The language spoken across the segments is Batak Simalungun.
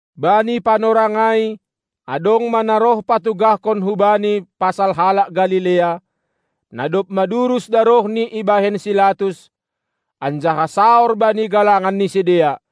Bani panorang ai adong ma na roh patugahkon hu Bani pasal halak Galilea, na dob madurus darohni ibahen si Latus, anjaha saor bani galangan ni sidea.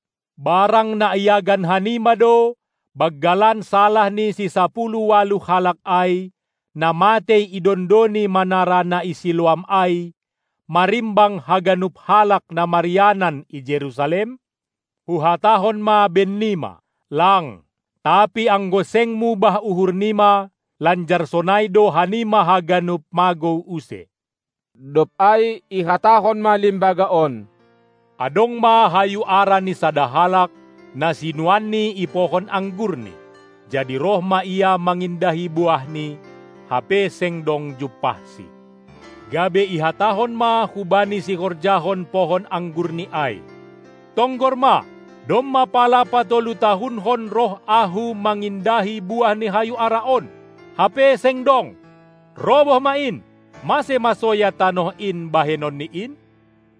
Barang na iagan hanima do banggalan salah ni sisapuluh ualuh halak ai, na matei idondoni manara na i Siloam ai, marimbang haganup halak na marianan i Jerusalem? Huhatahon ma bennima: Lang, tapi anggo seng mubah uhur nima, lanjar sonai do hanima haganup magou use. Dob ai ihatahon ma limbaga on: Adong ma hayu ara ni sada halak, na sinuanni i pohon anggurni; jadi roh ma ia mangindahi buahni, hape seng dong jumpahsi. Gabe ihatahon ma hubani sihorjahon pohon anggurni ai: Tonggor ma, domma pala patolu-tahunkon roh ahu mangindahi buah ni hayu ara on, hape seng dong. Roboh ma in, mase ma soya tanoh in bahenon ni in?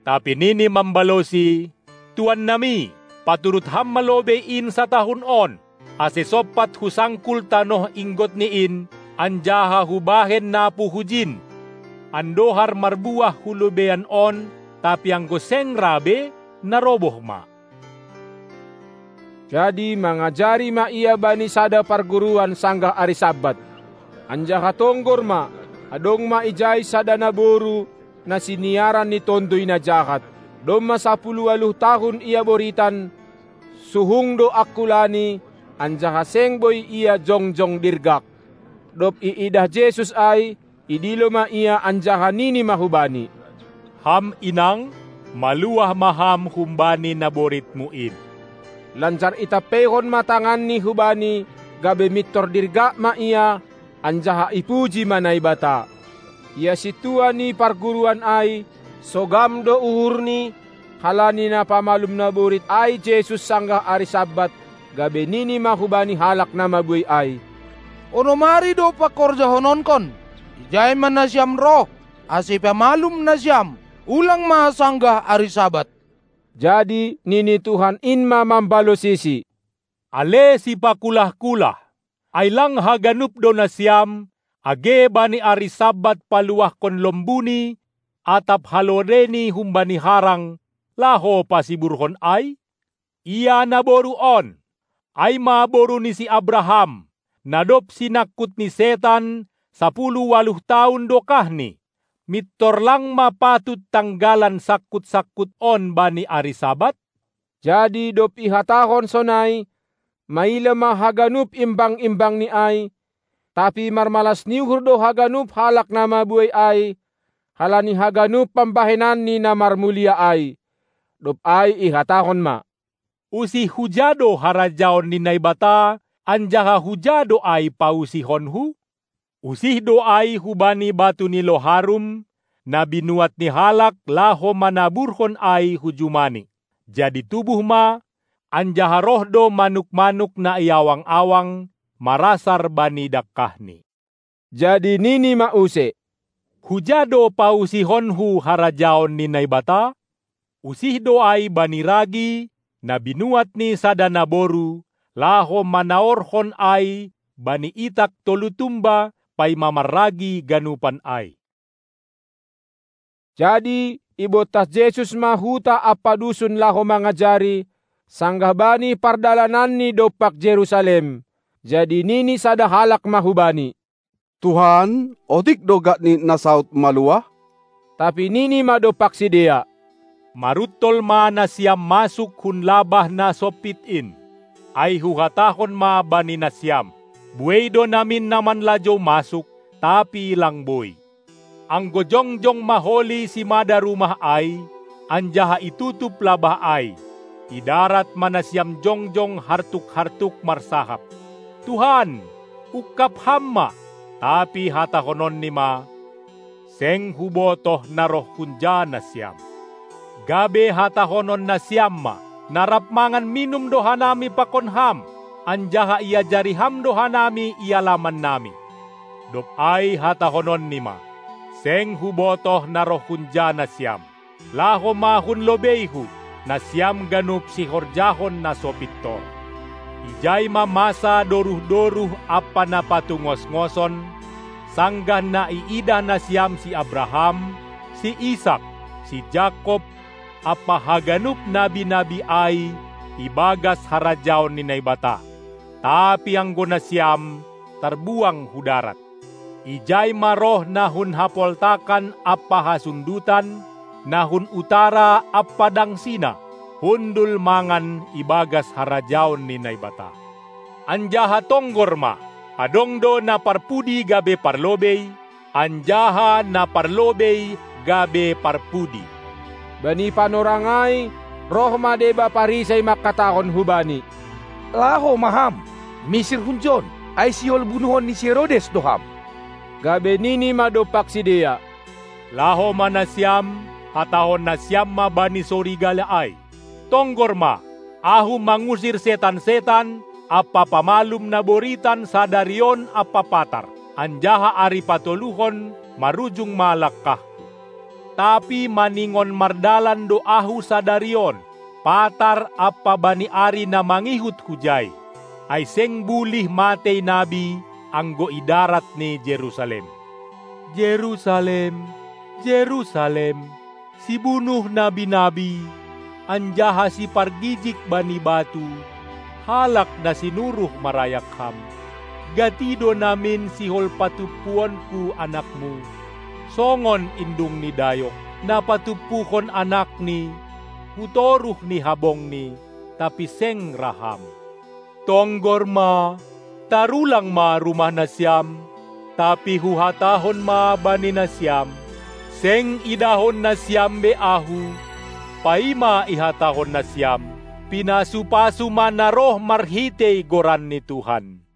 Tapi nini mambalosi: Tuan nami, paturut ham ma lobei in satahun on, ase sompat husangkul tanoh inggot ni in, anjaha hubahen napu hujin, andohar marbuah hu lobeian on; tapi anggo seng ra be, naroboh ma. Jadi mangajari ma Ia bani sada parguruan sanggah ari Sabat. Anjaha tonggor ma, adong ma ijai sada naboru na siniaran ni tonduy na jahat. Domma sapuluh ualuh tahun ia boritan, suhung do angkulani, anjaha seng boi ia jongjong dirgak. Dob iidah Jesus ai, idilo ma ia anjaha nini ma hubani: Ham inang, maluah ma ham humbani naboritmu in! Lanjar itampeihon ma tanganNi hubani; gabe mintor dirgak ma ia, anjaha ipuji ma Naibata. Ia sintua ni parguruan ai, sogam do uhurni, halani na pamalum naborit ai Jesus sanggah ari Sabat, gabe nini ma hubani halak na mabuei ai: Onom ari do pangkorjahononkon; ijai ma nasiam roh, ase ipamalum nasiam, ulang ma sanggah ari Sabat. Jadi nini Tuhan in ma mambalosisi: Ale sipakulah-kulah, ai lang haganup do nasiam, age bani ari Sabat paluahkon lombuni atap halodeni humbani harang, laho pasiburhon ai? Ia naboru on, ai ma boru ni si Abraham, na dob sinangkut ni setan sapuluh ualuh tahun dokahni, mintor lang ma patut tanggalan sangkut-sangkut on bani ari Sabat? Jadi dob ihatahon sonai, maila ma haganup imbang-imbangNi ai, tapi marmalas ni uhur do haganup halak na mabuei ai, halani haganup pambahenanNi na marmulia ai. Dob ai ihatahon ma: Usih huja do harajaon ni Naibata, anjaha huja do ai pausihonKu? Usih do ai hubani batu ni loharum, na binuat ni halak laho manaburhon ai hu jumani. Jadi tubuh ma, anjaha roh do manuk-manuk na i awang-awang marasar bani dangkahni. Jadi nini ma use: Huja do pausihonKu harajaon ni Naibata? Usih do ai bani ragi, na binuat ni sada naboru, laho manaorhon ai bani itak tolu tumba, paima marragi ganupan ai. Jadi ibontas Jesus ma huta ampa dusun laho mangajari, sanggah bani pardalananNi dompak Jerusalem. Jadi nini sada halak ma hu Bani: Tuhan, otik do gakni na saud maluah? Tapi Nini ma dompak sidea: Maruntol ma nasiam masuk hun labah na sompit in! Ai Huhatahon ma bani nasiam: buei do namin na manlajou masuk, tapi lang boi. Anggo jongjong ma holi simada rumah ai, anjaha itutup labah ai, idarat ma nasiam jongjong hartuk-hartuk marsahap: Tuhan, ungkab Ham ma! tapi hatahononNi ma: Seng hubotoh na roh hunja nasiam! Gabe hatahonon nasiam ma: Na rap mangan minum do hanami pakon Ham, anjaha iajari Ham do hanami i alaman nami. Dob ai hatahononNi ma: Seng Hubotoh na roh hunja nasiam. Laho ma hun lobeiHu, nasiam ganup sihorjahon na so pintor! Ijai ma masa doruh-doruh ampa na patungosngoson, sanggah na iidah nasiam si Abraham, si Isak, si Jakob ampa haganup nabi-nabi ai ibagas harajaon ni Naibata, tapi anggo nasiam tarbuang hu darat. Ijai ma roh na hun hapoltakan ampa hasundutan, na hun utara ampa dangsina, hundul mangan ibagas harajaon ni Naibata. Anjaha tonggor ma, adong do na parpudi gabe parlobei, anjaha na parlobei gabe parpudi. Bani panorang ai roh ma deba Parisei mangkatahon hu Bani: Laho ma Ham, misir hunjon, ai sihol bunuhon ni si Herodes do Ham. Gabe Nini ma dompak sidea: Laho ma nasiam, hatahon nasiam ma bani sorigala ai: Tonggor ma, Ahu mangusir setan-setan ampa pamalum na boritan sadari on ampa patar, anjaha ari patoluhon marujung ma langkahKu. Tapi maningon mardalan do Ahu sadari on, patar ampa bani ari na mangihut Hujai, ai seng bulih matei nabi anggo idarat ni Jerusalem. Jerusalem, Jerusalem, sibunuh nabi-nabi anjaha sipargijig bani batu halak na sinuruh marayak ham! Gati do namin sihol patumpuonku anakmu, songon indung ni dayok, na patumpuhon anakni hu toruh ni habongni, tapi seng ra ham! Tonggor ma, tarulang ma rumah nasiam. Tapi Huhatahon ma bani nasiam: Seng idahon nasiam be Ahu, paima ihatahon nasiam: Pinasu-pasu ma na roh marhitei goran ni Tuhan!